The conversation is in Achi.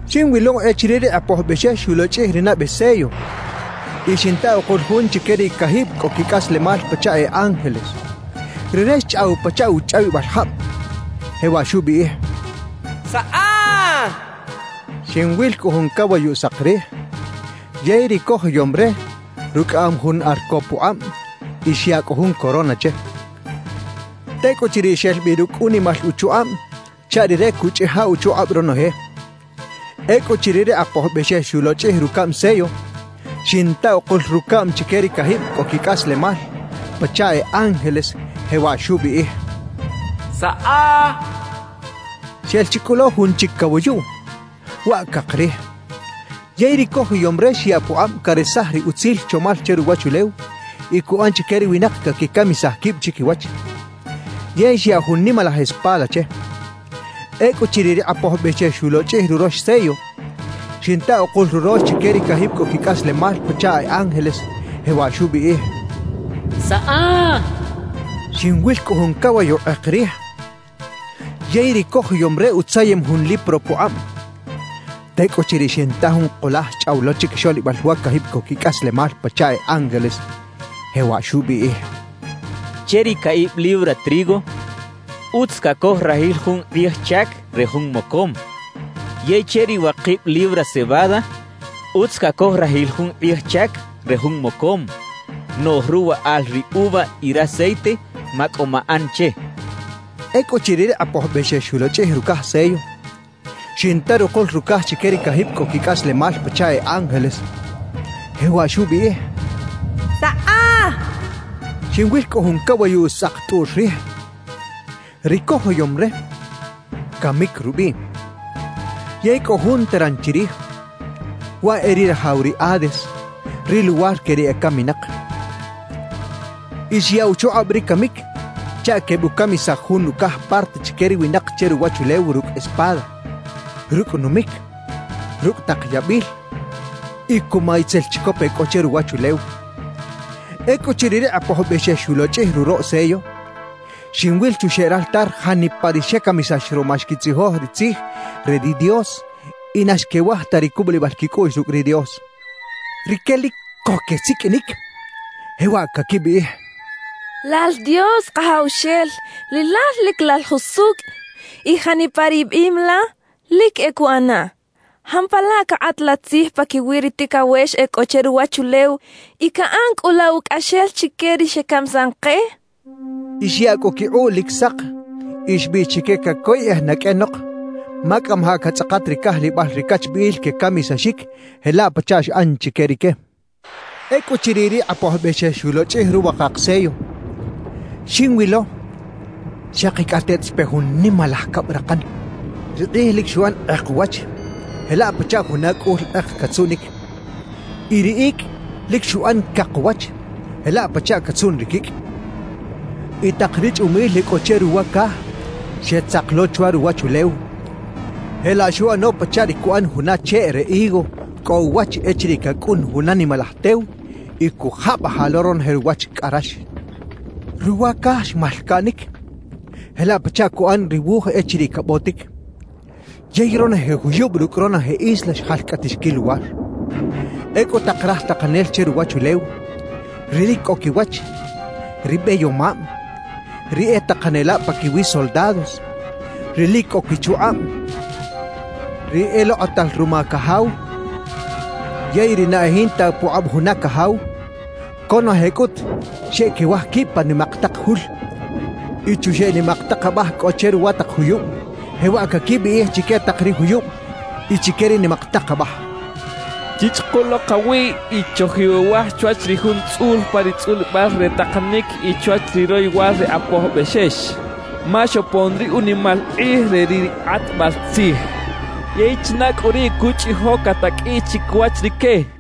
Xinwilo echiriꞌ ri Kꞌapoj Bexex xulochꞌij ri nabe sello y xinta ukul jun chique ri cajib cꞌo quicꞌaslemal pachaꞌ e ángeles. Rire xchꞌaw pachaꞌ uchꞌawibal jab, jewaꞌ xubiꞌij: «¡Saꞌa!» xchaꞌ. Xinwil cꞌu jun cawayuꞌ sak rij. Yey ri cojoyom re rucꞌaꞌam jun arco pukꞌab y xyaꞌ cꞌu jun corona che. Tecꞌuchiriꞌ xel bi rucꞌ unimal uchukꞌab chaꞌ rire cuꞌchꞌija uchukꞌab ronoje. Ecꞌuchiriꞌ ri Kꞌapoj Bexex xulochꞌij rucaꞌm sello, xinta ukul rucaꞌm chique ri cajib cꞌo quicꞌaslemal pachaꞌ e ángeles, jewaꞌ xubiꞌij: «¡Saꞌa!» xchaꞌ. Xel chi cꞌu lo jun chic cawayuꞌ, waꞌ cak rij. Yey ri cojoyom re xyaꞌ pukꞌab caresaj ri utzil chomal che ruwachulew y cuꞌan chique ri winak caquicamisaj quib chiquiwach. Yey xyaꞌ jun nimalaj espada che. Ecꞌuchiriꞌ ri Kꞌapoj Bexex xulochꞌij rurox sello, xinta ukul rurox chique ri cajib cꞌo quicꞌaslemal pachaꞌ e ángeles, jewaꞌ xubiꞌij: «¡Saꞌa!» xchaꞌ. Xinwil cꞌu jun cawayuꞌ kꞌek rij, yey ri cojoyom re utzayem jun lipro pukꞌab. Tecꞌuchiriꞌ xinta jun kulaj xchꞌaw lo chiquixoꞌlibal wa cajib cꞌo quicꞌaslemal pachaꞌ e ángeles, jewaꞌ xubiꞌij: «Che ri caꞌib libra trigo utz cacoj rajil jun kꞌij chac re jun mocom; yey che ri wakib libra cebada, utz cacoj rajil jun kꞌij chac re jun mocom. Noꞌj ruwaꞌal ri uva y raceite, macꞌo maꞌan che» xchaꞌ. Ecꞌuchiriꞌ ri Kꞌapoj Bexex xulochꞌij rucaj sello, xinta rukul rucaj chique ri cajib cꞌo quicꞌaslemal pachaꞌ e ángeles, jewaꞌ xubiꞌij: «¡Saꞌa!» xchaꞌ. Xinwil cꞌu jun cawayuꞌ saktꞌuꞌr rij. Ri cojoyom re, “Camic” rubiꞌ, yey cꞌo jun teran chirij, waꞌ e ri rajaw ri Hades, ri luwar que ri ecaminak. Y xyaꞌ uchukꞌab ri Camic chaꞌ quebucamisaj jun ucaj parte chique ri winak che ruwachulew rucꞌ espada, rucꞌ numic, rucꞌ tak yabil y cuma itzel chicop e cꞌo che ruwachulew. Ecꞌuchiriꞌ ri Kꞌapoj Bexex xulochꞌij ruroꞌ sello, xinwil chuxeꞌ raltar janipa ri xecamisax ruma xquitzijoj ri Tzij re ri Dios y na xquewaj ta ri cubulibal quicꞌuꞌx rucꞌ ri Dios. Rique lic co quesiqꞌuinic, jewaꞌ caquibiꞌij: «Lal Dios Kajawxel, Rilal lic Lal jusucꞌ y janipa ri biꞌim la, lic e cuꞌanaꞌ. ¿Jampalaꞌ cakꞌat la tzij paquiwi ri ticawex e cꞌo che ruwachulew y caꞌan cꞌu la ucꞌaxel chique ri xecamisan ke?» quechaꞌ. Y xyaꞌ cꞌu quikꞌuꞌ lic sak y xbiꞌx chique cacoyꞌej na qꞌuenok, ma cꞌamajaꞌ catzꞌakat ri cajlibal ri cachbiꞌil quecamisaxic jelaꞌ pachaꞌ xꞌan chique rique. Ecꞌuchiriꞌ ri Kꞌapoj Bexex xulochꞌij ruwakak sello, xinwilo xakicꞌateꞌt xpe jun nimalaj cabrakan. Ri kꞌij lic xuꞌan kꞌek uwach jelaꞌ pachaꞌ juna cꞌul kꞌek catzuꞌnic. Y ri icꞌ lic xuꞌan cak uwach jelaꞌ pachaꞌ catzuꞌn ri quicꞌ. Y tak ri chꞌumil e cꞌo che ruwa caj xetzak lo chwa ruwachulew, jelaꞌ xuꞌano pachaꞌ ri cuꞌan juna cheꞌ re higo cꞌo uwach echiriꞌ cacꞌun juna nimalaj tew y cujabajaꞌ lo ronoje ruwach cꞌa rax. Ruwa caj xmalcaꞌnic jelaꞌ pachaꞌ cuꞌan ri wuj echiriꞌ cabotic. Yey ronoje juyub rucꞌ ronoje isla xjalcꞌatix quiluwar. Ecꞌu tak raj takanel che ruwachulew, ri lic cꞌo quiwach, ri beyomab, ri e takanelab paquiwi soldados, ri lic cꞌo quichukꞌab, ri elokꞌotal ruma cajaw yey ri na e jinta pukꞌab juna cajaw, conoje cꞌut xeꞌquewaj quib pa nimak tak jul y chuxeꞌ nimak tak abaj cꞌo che ruwa tak juyub, jewaꞌ caquibiꞌij chique tak ri juyub y chique ri nimak tak abaj: «Chichꞌuku lo kawiꞌ y chojiwewaj chwach ri Jun tzꞌul pa ri tzꞌulibal re takanic y chwach ri royowal ri Kꞌapoj Bexex. Ma xopon ri unimal kꞌij re ri kꞌatbal tzij. ¿Yey china cꞌu ri cuchꞌijo cataqꞌuiꞌ chiquiwach rique?» quechaꞌ.